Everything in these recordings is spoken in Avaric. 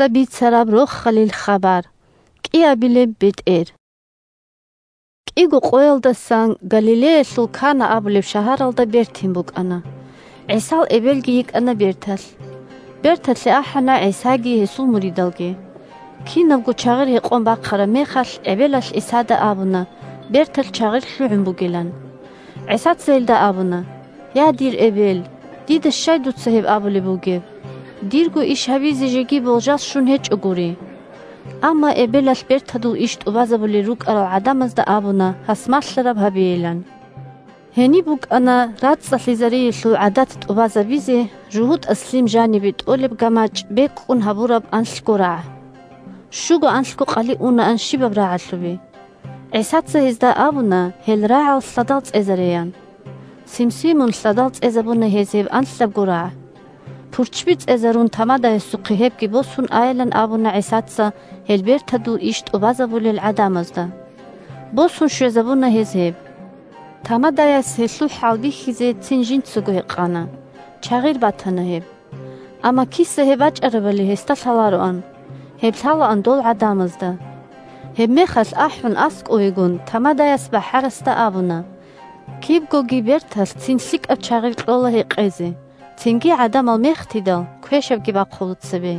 бетӀер Канаялда бертин 1КӀиго къоялдасан Галилеялъул Кана абулеб шагьаралда бертин букӀана. ГӀисал эбелги йикӀана берталъ. 2Берталъе ахӀана ГӀисаги гьесул муридалги. Кинабго чагъир гьекъон бахъараб мехалъ, эбелалъ ГӀисада абуна берталъ чагъир лъугӀун бугилан. ГӀисаца гьелда абуна: – Я, дир эбел, дида щай дуца гьеб абулеб бугеб? Дирго иш гьабизе жеги болжал щун гьечӀогури. Амма эбелалъ бертадул иш тӀубазабулел рукӀарал гӀадамазда абуна гьас малъараб гьабейилан. Гьениб букӀана рацӀцӀалъизариялъул гӀадат тӀубазабизе жугьутӀаз лъим жанибе тӀолеб гамачӀ бекӀкӀун гьабураб анлъго рагӀ. Щуго-анлъго къали унаан щибаб рагӀалъубе. ГӀисаца гьезда абуна гьел рагӀал лъадал цӀезареян. Симсимун лъадал цӀезабуна гьез гьеб анлъабго рагӀ. Пурччби цӀезарун тамадаясухъе гьебги босун айилан абуна ГӀисаца гьел бертадул иш тӀубазабулел гӀадамазда. Босун щвезабуна гьез гьеб. Тамадаяс гьелъул хӀалбихьизе цин жинцаго гьекъана. Чагъир батана гьеб. Амма киса гьеб бачӀарабали гьесда лъалароан. Гьеб лъалаан дол гӀадамазда. Гьебмехалъ, ахӀун аскӀовегун, тамадаяс бахӀарасда абуна: – Кибгоги берталъ цин лъикӀаб чагъир кьола гьекъезе, цинги гӀадамал мехтидал, квешабги бахъула цебе.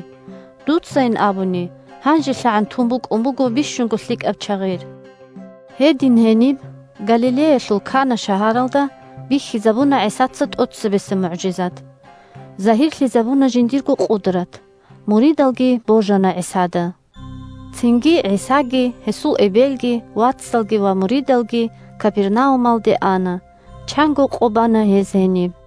Дуцайин абуни гьанжелъагӀан тун букӀун буго бищунго лъикӀаб чагъир. Гьедин гьениб – Галилеялъул Кана шагьаралда – бихьизабуна ГӀисаца тӀоцебесеб мугӀжизат. Загьирлъизабуна жиндирго къудрат. Муридалги божана ГӀисада. Цинги ГӀисаги, гьесул эбелги, вацалги ва муридалги Капернаумалде ана. Чанго къо бана гьез гьениб.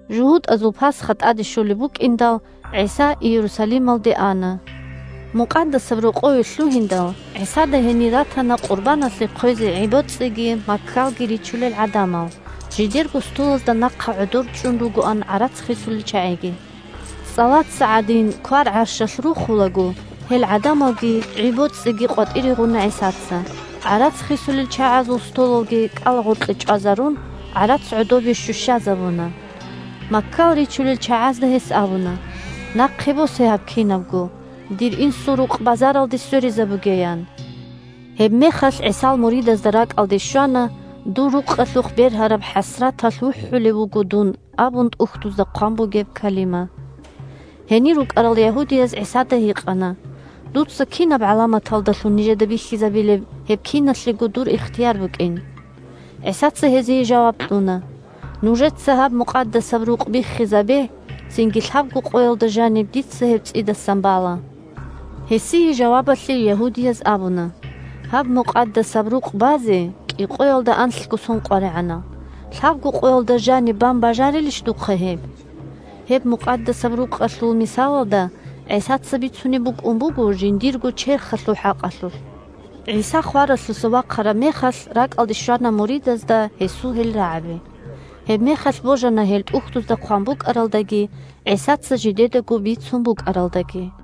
ЖугьутӀазул Пасха тӀаде щолеб букӀиндал, ГӀиса Иерусалималде ана. Мукъадасаб Рокъове лъугьиндал, ГӀисада гьенир ратана къурбаналъе хъвезе гӀи-боцӀиги маккалги ричулел гӀадамал, жидерго столазда нахъа гӀодор чӀун ругоан гӀарац хисулел чагӀиги. ЦӀалаца гӀадин квар-гӀарщалъ рухулаго гьел гӀадамалги гӀи-боцӀиги къватӀире гъуна ГӀисаца, гӀарац хисулел чагӀазул столалги кӀалагъоркье чӀвазарун, гӀарац гӀодобе щущазабуна. Маккал ричулел чагӀазда гьес абуна: – Нахъе босе гьаб кинабго. Дир Инсул рукъ базаралде сверизабуге, – ян. Гьебмехалъ ГӀисал муридазда ракӀалде щвана: «Дур рукъалъухъ бергьараб хӀасраталъ вухӀулев вуго дун», – абун ТӀухьдузда хъван бугеб калима. Гьенир рукӀарал ягьудияз ГӀисада гьикъана: – Дуца кинаб гӀаламаталдалъун нижеда бихьизабилеб гьеб киналъего дур ихтияр букӀин? ГӀисаца гьезие жаваб кьуна: – Нужеца гьаб Мукъадасаб Рукъ биххизабе, цинги лъабго къоялда жаниб дица гьеб цӀидасан бала. Гьесие жавабалъе ягьудияз абуна: – Гьаб Мукъадасаб Рукъ базе кӀикъоялда анлъго сон къваригӀана. Лъабго къоялда жаниб бан бажарилищ духъа гьеб? Гьеб Мукъадасаб Рукъалъул мисалалда ГӀисаца бицунеб букӀун буго жиндирго черхалъул хӀакъалъулъ. ГӀиса хваралъуса вахъараб мехалъ ракӀалде щвана муридазда гьесул гьел рагӀаби. Гьебмехалъ божана гьел ТӀухьдузда хъван букӀаралдаги ГӀисаца жидедаго бицун букӀаралдаги.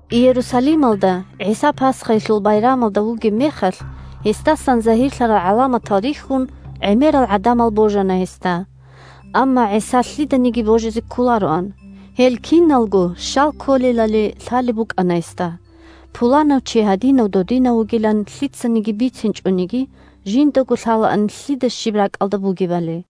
Иерусалималда ГӀиса Пасхаялъул байрамалда вугеб мехалъ, гьесдасан загьирлъарал гӀаламатал рихьун, гӀемерал гӀадамал божана гьесда. Амма ГӀиса лъиданиги божизе кколароан. Гьел киналго щал кколелали лъалеб букӀана гьесда. Пуланав чи гьадинав-додинав вугилан лъицаниги бицинчӀониги, жиндаго лъалаан лъида щиб ракӀалда бугебали.